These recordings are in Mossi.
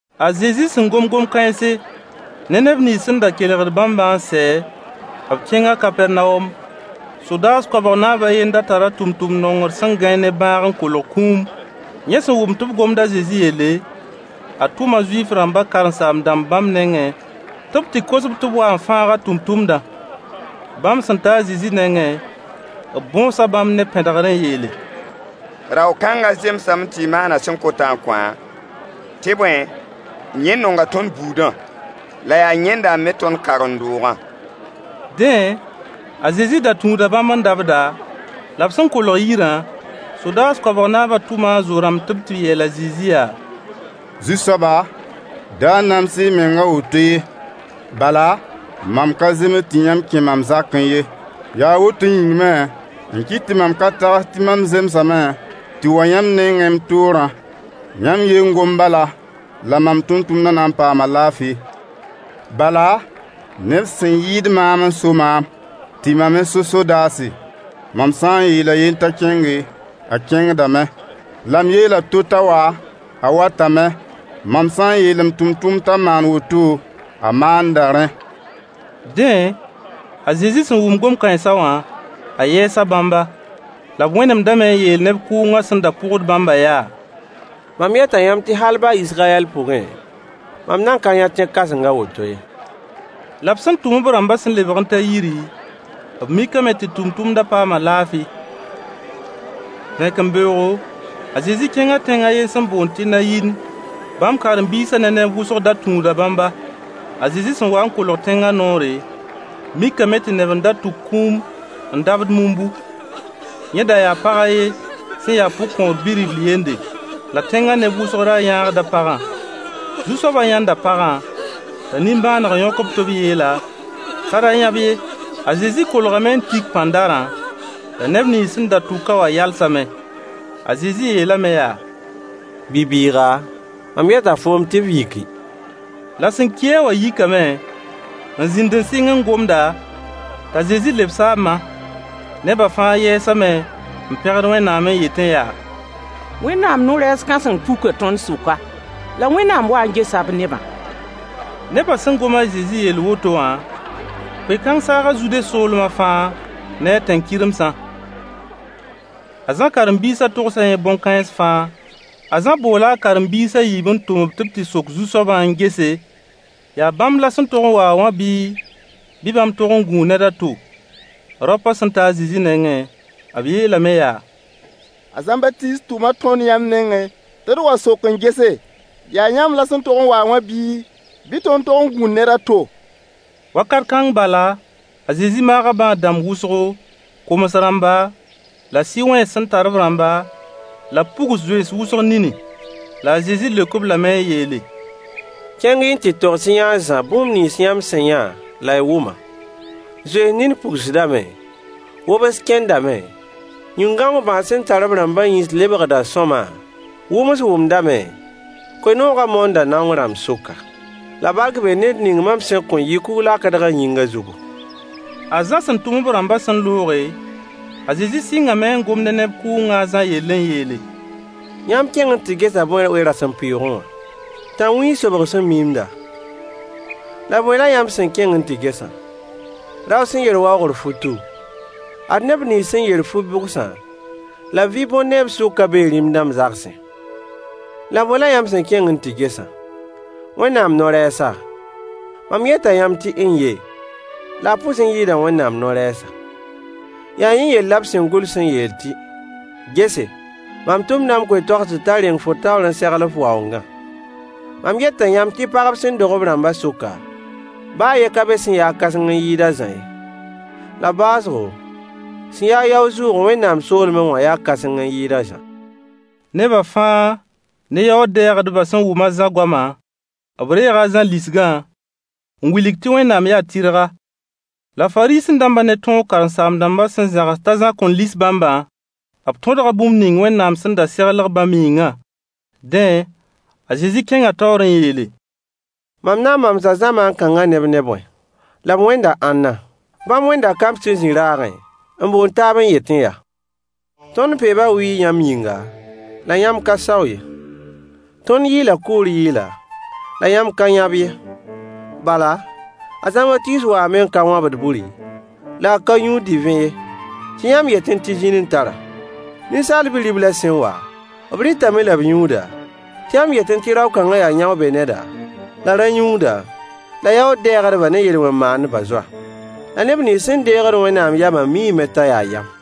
A Zezi sẽn gom gom-kãense ne neb nins sẽn da kelgd bãmba n sɛ, b kẽnga Kapɛrnawom. Sodaas koabg naab a ye n da tar a tʋmtʋmd nongr sẽn gãe ne bãag n kolg kũum. Yẽ sẽn wʋm tɩ b gomd a Zezi yelle, a tʋma Zuif-rãmbã kãsem-dãmb bãmb nengẽ tɩ b tɩ kos-b tɩ b wa n fãag a tʋmtʋmdã. Bãmb sẽn ta a Zezi nengẽ, b bõosa bãmb ne pẽdgr n yeele: Rao-kãngã zemsame tɩ y maan a sẽn kotã n kõ-a. Tɩ bõe, yẽ nonga tõnd buudã, la yaa yẽnda n me tõnd karen-doogã. Dẽ, a Zezi da tũuda bãmb n dabda, la b sẽn kolg yirã, sodaas koabg naabã tʋma a zo-rãmb tɩ b tɩ yeel a Zezi yaa: Zu-soaba, da nams-y y meng a woto ye. Bala, mam ka zems tɩ yãmb kẽ mam zakẽ ye. Yaa woto yĩng me n kɩt tɩ mam ka tags tɩ mam zemsame tɩ wa yãmb nengẽ m toorã. Yãmb ye n gom bala, la mam tʋmtʋmdã na n paama laafɩ. Bala, neb sẽn yɩɩd maam n so maam, tɩ mam me so sodaase. Mam sã n yeel a yen t'a kẽnge, a kẽngdame, la m yeel a to t'a wa, a watame. Mam sã n yeel m tʋmtʋmd t'a maan woto, a maanda rẽ. Dẽ, a Zezi sẽn wʋm gom-kãensã wã, a yɛɛsa bãmba. La b wẽnemdame n yeel neb kʋʋngã sẽn da pʋgd bãmbã yaa: Mam yeta yãmb tɩ hal baa Israyɛl pʋgẽ, mam nan ka yã tẽ-kãseng a woto ye. La b sẽn tʋm-b rãmbã sẽn lebg n ta yiri, b mikame tɩ tʋmtʋmda paama laafɩ. Vẽkembeoogo, a Zezi kẽnga tẽng a yen sẽn boond tɩ Nayin. Bãmb karen-biisã ne neb wʋsg da tũuda bãmba. A Zezi sẽn wa n kolg tẽngã noore, mikame tɩ neb n da tʋk kũum n dabd mumbu. Yẽ da yaa pag a yen sẽn ya pʋgkõor bi-ribl yende. La tẽngã neb wʋsg ra yãagda pagãm Zu-soabã yãnda pagã, t'a nimbãaneg yõk-b tɩ b yeel-a t'a ra yãb ye. A Zezi kolgame n tik pãndarã, la neb nins sẽn da tʋk-a wã yalsame. A Zezi yeelame yaa: Bi-bɩɩga, mam yeta foom tɩ f yiki. La sẽn ki-a wã yikame n zĩnd n sɩng n gomda, t'a Zezi lebs-a a ma. Neba fãa yɛɛsame n pẽgd Wẽnnaam n yetẽ yaa: Wẽnnaam no-rɛɛs kãseng puka tõnd sʋka, la Wẽnnaam waa n gesa b nebã. Nebã sẽn gom a Zezi yell woto wã, koe-kãng saaga Zude soolmã fãa ne a tẽn-kɩremsã. A Zã karen-biisã togsa yẽ bõn-kãens fãa. A Zã boola a karen-biis a yiib n tʋm-b tɩ b tɩ sok Zu-soabã n gese, yaa bãmb la sẽn tog n wa-a wã bii, bɩ bãmb tog n gũu ned a to. Raopã sẽn ta a Zezi nengẽ, b yeelame yaa: A Zãmbatiis tʋma tõnd yãmb nengẽ tɩ d wa sok n gese, yaa yãmb la sẽn tog n wa-a wã bii, bɩ tõnd tog n gũu ned a to? Wakat kãng bala, a Zezi maaga bãad-dãmb wʋsgo, koms-rãmba, la sɩ-wẽns sẽn tar-b rãmba, la b pugs zoens wʋsg nini. La a Zezi leok-b lame n yeele: kẽng-y n tɩ togs-y-yã a Zã bũmb nins yãmb sẽn yã la y wʋmã: Zoens nin pugsdame, wobs kẽndame, yĩn-gãong bãas sẽn tar b rãmbã yĩns lebgda sõama, wʋms wʋmdame, koe-noogã moonda naong rãmb sʋka. La bark bee ned ning mam sẽn kõn yɩ kug-lakdg a yĩngã zugu. A Zã sẽn tʋm-b rãmbã sẽn looge, a Zezi sɩngame n gom ne neb kʋʋngã a Zã yell n yeele: Yãmb kẽng n tɩ gesa bõe we-rasempʋɩɩgẽ wã? Tãnwĩig sobg sẽn miimda? La bõe la yãmb sẽn kẽng n tɩ gesã? Rao sẽn yer waoogr futu? Ad neb nins sẽn yer fu-bʋgsã, la b vɩ bõn neeb sʋkã bee rĩm-dãmb zagsẽ. La boẽ la yãmb sẽn kẽng n tɩ gesã? Wẽnnaam no-rɛɛsa? Mam yeta yãmb tɩ n-ye, la a pʋs n yɩɩda Wẽnnaam no-rɛɛsa. Yaa yẽ yell la b sẽn gʋls n yeel tɩ: “Gese, mam tʋmda m koe-toagsd t'a reng fo taoor n segl f waoongã.” Mam yeta yãmb tɩ pagb sẽn dog b rãmbã sʋka, baa a yen ka be sẽn ya-a kãseng n yɩɩd a Zã ye. La baoosgo, sẽn ya-a yao-zʋʋg Wẽnnaam soolmẽ wã yaa kãseng n yɩɩd a Zã. Neba fãa ne yaood-dɛɛgdbã sẽn wʋm a Zã goama, b reega a Zã lisgã, n wilg tɩ Wẽnnaam yaa tɩrga. La Fariisẽ-dãmbã ne tõog karen-saam-dãmbã sẽn zãgs t'a Zã kõn lis bãmbã, b tõdga bũmb ning Wẽnnaam sẽn da seglg bãmb yĩngã. Dẽ, a Zezi kẽnga taoor n yeele: Mam na n mamsa zamaan kãngã neb ne bõe? La b wẽnda ãnna? Bãmb wẽnda kamb sẽn zĩ raagẽ n boond taab n yetẽ yaa: Tõnd peeba wɩɩg yãmb yĩnga, la yãmb ka sao ye. Tõnd yɩɩla kʋʋr yɩɩla, la yãmb ka yãb ye. Bala, a Zãmbatiis waame n ka wãbd buri, la a ka yũud divẽ ye, tɩ yãmb yetẽ tɩ zĩn n tar-a. Ninsaal bi-riblã sẽn wa, b rɩtame la b yũuda, tɩ yãmb yetẽ tɩ rao-kãnga yaa yão-be-neda, la rã-yũuda, la yaood-dɛɛgdbã ne yel-wẽn maandbã zoa. La neb nins sẽn deegd Wẽnnaam yamã miime t'a yaa yam.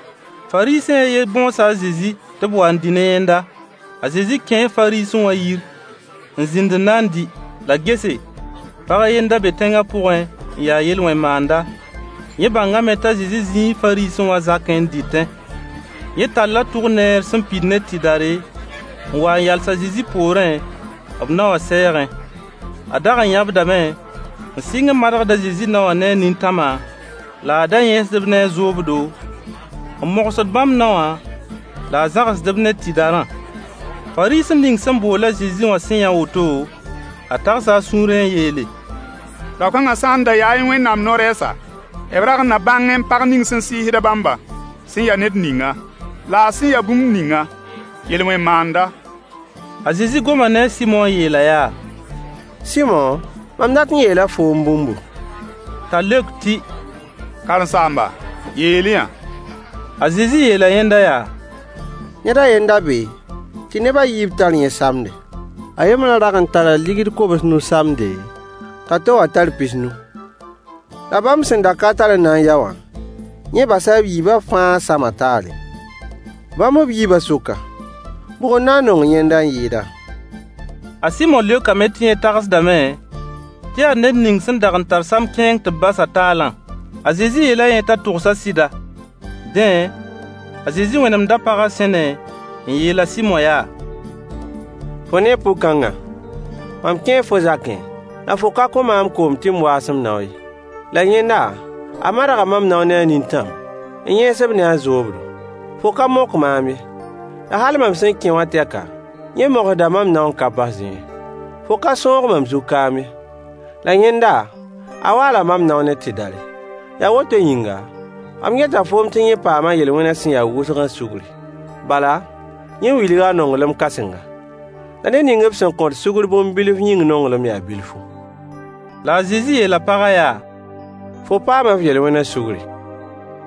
Fariisẽ a yen bõosa a Zezi tɩ b wa n dɩ ne yẽnda. A Zezi kẽe Fariisẽ wã yir n zĩnd n na dɩ. La gese, pag a ye n da be tẽngã pʋgẽ n ya yel-wẽn maanda. Yẽ bãngame t'a Zezi zĩi Fariisẽ wã zakẽ n dɩtẽ. Yẽ talla albatr tʋk sẽn pid ne tɩdare, n wa n yals a Zezi poorẽ, b nao wã sɛɛgẽ. A dag n yãbdame, n sɩng n madgd a Zezi nao wã ne a nintãma, la a da yẽesd-b ne a zoobdo, n mogsd bãmb naowã la a zãgsd-b ne tɩdarã. Fariisẽ ning sẽn bool a Zezi wã sẽn yã woto, a tagsa a sũurẽ n yeele: rao-kãngã sã n da yaẽ Wẽnnaam no-rɛɛsa, b rag n na bãngẽ pag ning sẽn sɩɩsd bãmbã sẽn ya ned ninga, la a sẽn ya bũmb ninga: yel-wẽn maanda. A Zezi goma ne a Sɩmo n yeel-a yaa: Sɩmo, mam dat n yeela foom bũmbu. T'a leok tɩ: Karen-saamba, yeel-y-yã. A Zezi yeela yẽnda yaa: ned a ye n da be tɩ neb a yiib tar yẽ samde. A yembrã dag n tara deniye kobs-nu samde, t'a to wã tar pis-nu. La bãmb sẽn da ka tar n na yao wã, yẽ basa b yiibã fãa samã taale. Bãmb b yiibã sʋka, bʋg n na n nong yẽnda n yɩɩda? A Sɩmo leokame tɩ yẽ tagsdame tɩ yaa ned ning sẽn dag n tar sam-kẽeng tɩ b bas-a taalã. A Zezi yeela yẽ t'a togsa sɩda. Dẽ, a Zezi wẽnemda paga sẽne n yeel a Sɩmo yaa: Fo nee pʋg-kãngã? Mam kẽe fo zakẽ, la fo ka kõ maam koom tɩ m waas m nao ye. La yẽnda, a madga mam nao ne a nintãm, n yẽes-b ne a zoobdo. Fo ka mok maam ye, la hal mam sẽn kẽ wã tɛka, yẽ mogsda mam nao n ka basdẽ ye. Fo ka sõog mam zug kaam ye, la yẽnda, a waala mam nao ne tɩdare. Yaa woto yĩnga, mam yeta foom tɩ yẽ paama a yel-wẽna sẽn yaa wʋsgã sugri. Bala, yẽ wilga a nonglem kãsenga. La ned ning b sẽn kõt sugr bũmb bilf yĩng nonglem yaa bilfu. La a Zezi yeela pagã yaa: fo paama f yel-wẽna sugri.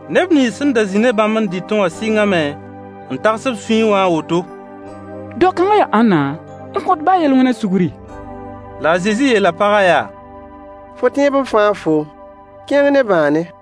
Neb nins sẽn n da zĩ ne bãmb n dɩtẽ wã sɩngame n tags b sũyẽ wã a woto: dao-kãngã yaa ãnna n kõt baa yel-wẽna sugri? La a Zezi yeela pagã yaa: fo tẽeb n fãag foom. Kẽng ne bãane.